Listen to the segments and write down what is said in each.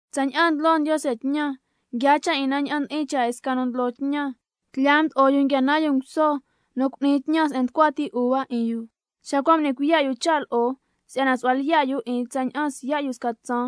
Tsaña'an ndlo Ndiose tñan, nguiaa cha' 'in na ña'an ndi'in cha' 'in sca nu ndlo tñan, lo' tlya mdo'o yu nguia nan yu nguso nu cu'ni tñan se'en nducua ti uva 'in yu. Xa cua' m'ni cuiya' yu cha' lo'o si'yana su'hua lyiya' yu 'in tsaña'an siya' yu sca tsaan,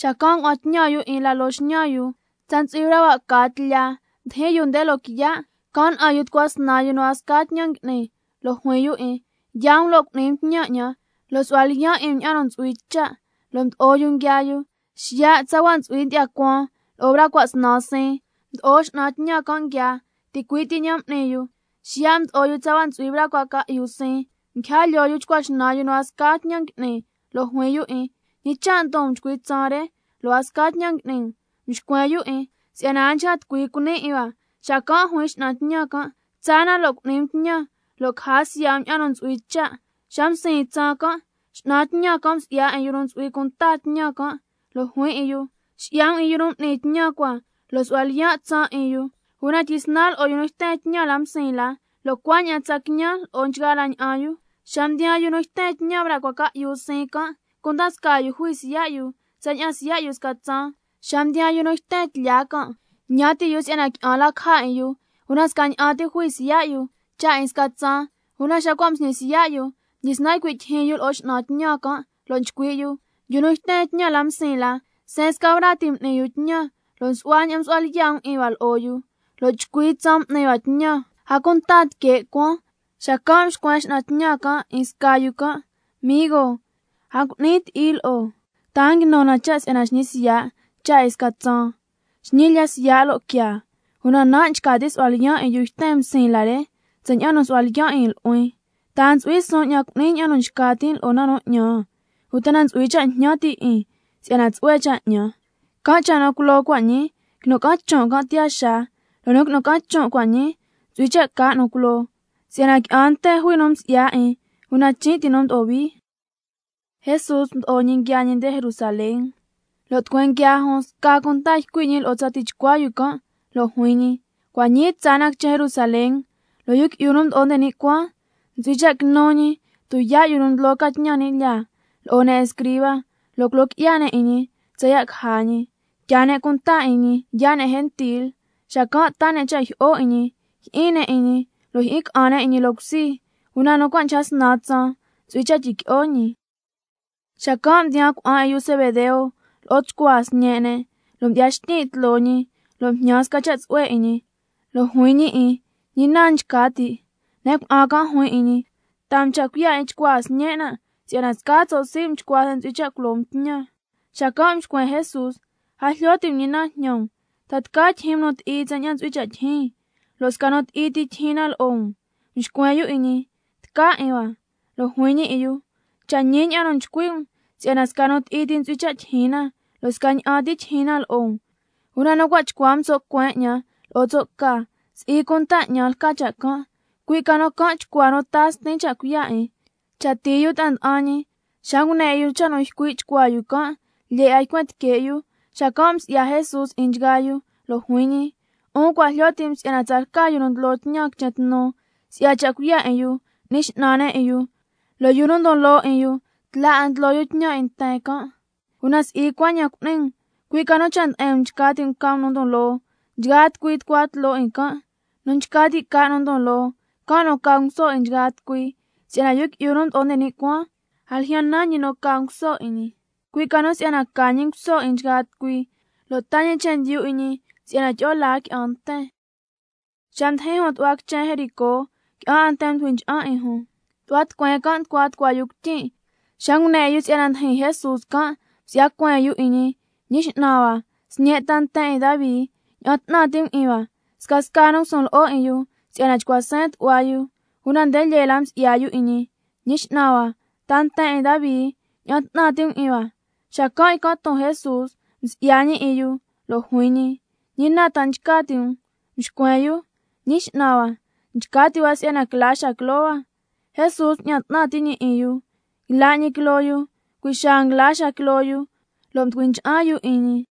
xacan' ngua'an tñan yu 'in la loo xñan yu. Tsa ntsu'hui braa cua' caa tlya mdijin yu nde loquiya', can' na'an yu tucua snan yu nu a sca tñan ngui'ni, lo' juin yu 'in: Yaa um lo' cu'ni um tñan 'ñan, lo' su'hua lyiyan' 'in um ña'an nu ntsu'hui cha', lo' mdo'o yu nguiaa yu. Xiya' tsa ntsu'hui ndyi'ya cuaan lo'o braa cua' snan siin, mdo'o x'nan tñan can' nguiaa, ticui' ti ña'an m'ni yu. Xiya' mdo'o yu tsa ntsu'hui braa cua' ca'yu siin, nguija lyoo chcua xnan yu nu a sca tñan ngui'ni, lo' juin yu 'in: ¿Ñi cha' ndon um chcui tsaan re, lo' a sca tñan ngui'ni um? Mxcuen yu 'in: Si'yana a nchca tucui cuni 'in hua. Xacan' juin x'nan tñan can': Tsaa na lo' cu'ni um tñan, lo' caja siya' um ña'an nu ntsu'hui cha'. Xa msiin tsaan can', x'nan tñan can' msi'ya 'in yu nu ntsu'hui cunta tñan, lo' juin 'in yu: Xi'ya 'in yu nu m'ni tñan cua lo' su'hua lyiya' tsaan 'in yu, una tyisnan lo'o yu nu yten tñan la msiin la, lo' cuaña'an tsa quiñan lo'o nchgaa la ña'an yu. Xa mdiyaan yu nu yten tñan braa cua' ca'yu siin can', cunda scaa yu jui siya' yu tsaña'an siya' yu sca tsaan. Xa mdiyaan yu nu yten tlya can', ñan ti' yu si'yana qui'an la caja 'in yu, una scaña'an ti jui siya' yu, cha' 'in sca tsaan. Una xa cua' msñi siya' yu, xacan' mdyisnan ycui' tyijyin yu lo'o x'nan tñan can', lo' nchcui' yu: Yu nu yten tñan la msiin la, seen sca braa ti m'ni yu tñan, lo' su'hua ña'an msu'hua lyiya' um 'in hua lo'o yu, lo' chcui tsaan m'ni hua tñan, a cunta tique' cuaan. Xacan' mxcuen x'nan tñan can' 'in sca yu can': Migo, a ngui'nin ti'i lo'o, ¿ta a nguinu na cha' si'yana xñi siya' cha' 'in sca tsaan? Xñi lya siya' lo' quiaa, una nan' nchca tin' su'hua lyiyan' 'in yu nu yten msiin la re, tsaña'an nu msu'hua lyiyan' 'in nu'huin. ¿Ta a ntsu'hui suun 'ñan cu'nin ña'an nu nchca tin' lo'o na nu 'ñan? ¿Uta na ntsu'hui cha' jñan ti' 'in si'yana tsu'hue cha' 'ñan? Can' cha' nu culoo cua' ñii, quinu ca'an chon' can' tiyaa xaa, lo' nu nguinu ca'an chon' cua' ñii, ntsu'hui cha' ca nu culoo, si'yana qui'an nten jui nu msi'ya 'in, una chin' ti nu mdo'o hui. Jesús mdo'o ñi nguiaa ñi quichen Jerusalén, lo' tucueen nguiaa jun sca cunta ycui' ñi lo'o tsa tichcua yu can', lo' juin ñi: Cua' ñii tsaa na quichen Jerusalén, lo' Yu Qui'yu nu Mdo'o nde ni' Cuaan, ntsu'hui cha' quinu ñi tuyaa' yu nu ndlo ca tñan ni' lyaa, lo'o ne' escriba, lo' culo qui'ya ne' 'in ñi tsaya' caja ñi. Tyaa ne' cunta 'in ñi yaa' ne' gentil, xacan' taa ne' cha' jyi'o 'in ñi, jyi'in ne' 'in ñi lo' jyi'in ca'an ne' 'in ñi loo cusi, una nu cua' ca snan tsaan ntsu'hui cha' tyiqui'o ñi. Xacan' mdiyaan cuna'an 'in yu Zebedeo lo'o chcuaa sñe' ne', lo' mdyi'ya xtyin' tloo ñi, lo' mjñan sca cha' tsu'hue 'in ñi. Lo' juin ñi 'in: ¿Ñi na nchca ti'? Ne' cuna'an can' juin 'in ñi: Taa um cha' cuiya' 'in chcuaa sñen' nan', si'yana scaa tso' sii' um chcua se'en ntsu'hui cha' culo um tñan. Xacan' mxcuen Jesús: A jlyo ti' um ñi na njñan um. ¿Ta tca tyijyin um nu ti'i tsaña'an ntsu'hui cha' tijin, lo' sca nu ti'i ti tyijyin na lo'o um? Mxcuen yu 'in ñi: Tca 'in hua. Lo' juin ñi 'in yu: Cha' ñi ña'an nu nchcui' um si'yana sca nu ti'i ti ntsu'hui cha' tyijyin na, lo' scaña'an ti tyijyin na lo'o um. Una nu chcua um tso' cueen 'ñan lo'o tso' ca, si'i cunta 'ñan lca cha' can', cui' ca nu can' chcua nu taa Stin cha' cuiya' 'in. Cha tii yu ta'a nda'an ñi, xa ngune 'in yu cha' nu ycui' chcuaa yu can', lyee 'a ycuen tique' yu. Xacan' msi'ya Jesús 'in nchgaa yu, lo' juin ñi: 'Un cua' jlyo ti' um si'yana tsalca yu nu ndlo tñan quichen tnu, si'ya cha' cuiya' 'in yu n'ni x'nan ne' 'in yu, lo' yu nu ndon loo 'in yu tla 'a ndlo can' tñan. Una si'i cuaña'an cu'ni um, cui' ca nu cha' nde'en um nchca ti' um ca um nu ndon loo, can' nu tucua tloo nchgaa tucui. Nu nchca ti' ca nu ndon loo, can' nu ca nguso 'in nchgaa tucui. Si'yana Yu Qui'yu nu Mdo'o nde ni' Cuaan, a ljyan nan ñi nu ca nguso 'in ñi, cui' ca nu si'yana ca ñi nguso 'in nchgaa tucui, lo' taa ñi chendyu 'in ñi si'yana tyi'o laa qui'an nten. Xa mdijin jun tu'hua quichen Jericó, qui'an 'a nten mducui ncha'an 'in jun. Tu'hua tucueen can' nducua tucua yu cuityin', xa ngune 'in yu si'yana ndijin Jesús can', msi'ya cueen yu 'in ñi: Ñi X'nan hua, Sñe' ta nten 'in Davi, ña'an 'tnan ti' um 'in hua. Scasca nu ngusun lo'o 'in yu si'yana chcua seen tu'hua yu, una nde lyee la msi'ya yu 'in ñi: Ñi X'nan hua, ta nten 'in Davi, ña'an 'tnan ti' um 'in hua. Xacan' ycan' ton Jesús, msi'ya ñi 'in yu lo' juin ñi: ¿Ñi na ta nchca ti' um? Mxcuen yu: Ñi X'nan hua, nchca ti' hua si'yana quila xaa quiloo hua. Jesús mña'an 'tnan ti' 'in yu, yla' ñi quiloo yu, cui' xaa nguila xaa quiloo yu, lo' mducui ncha'an yu 'in ñi.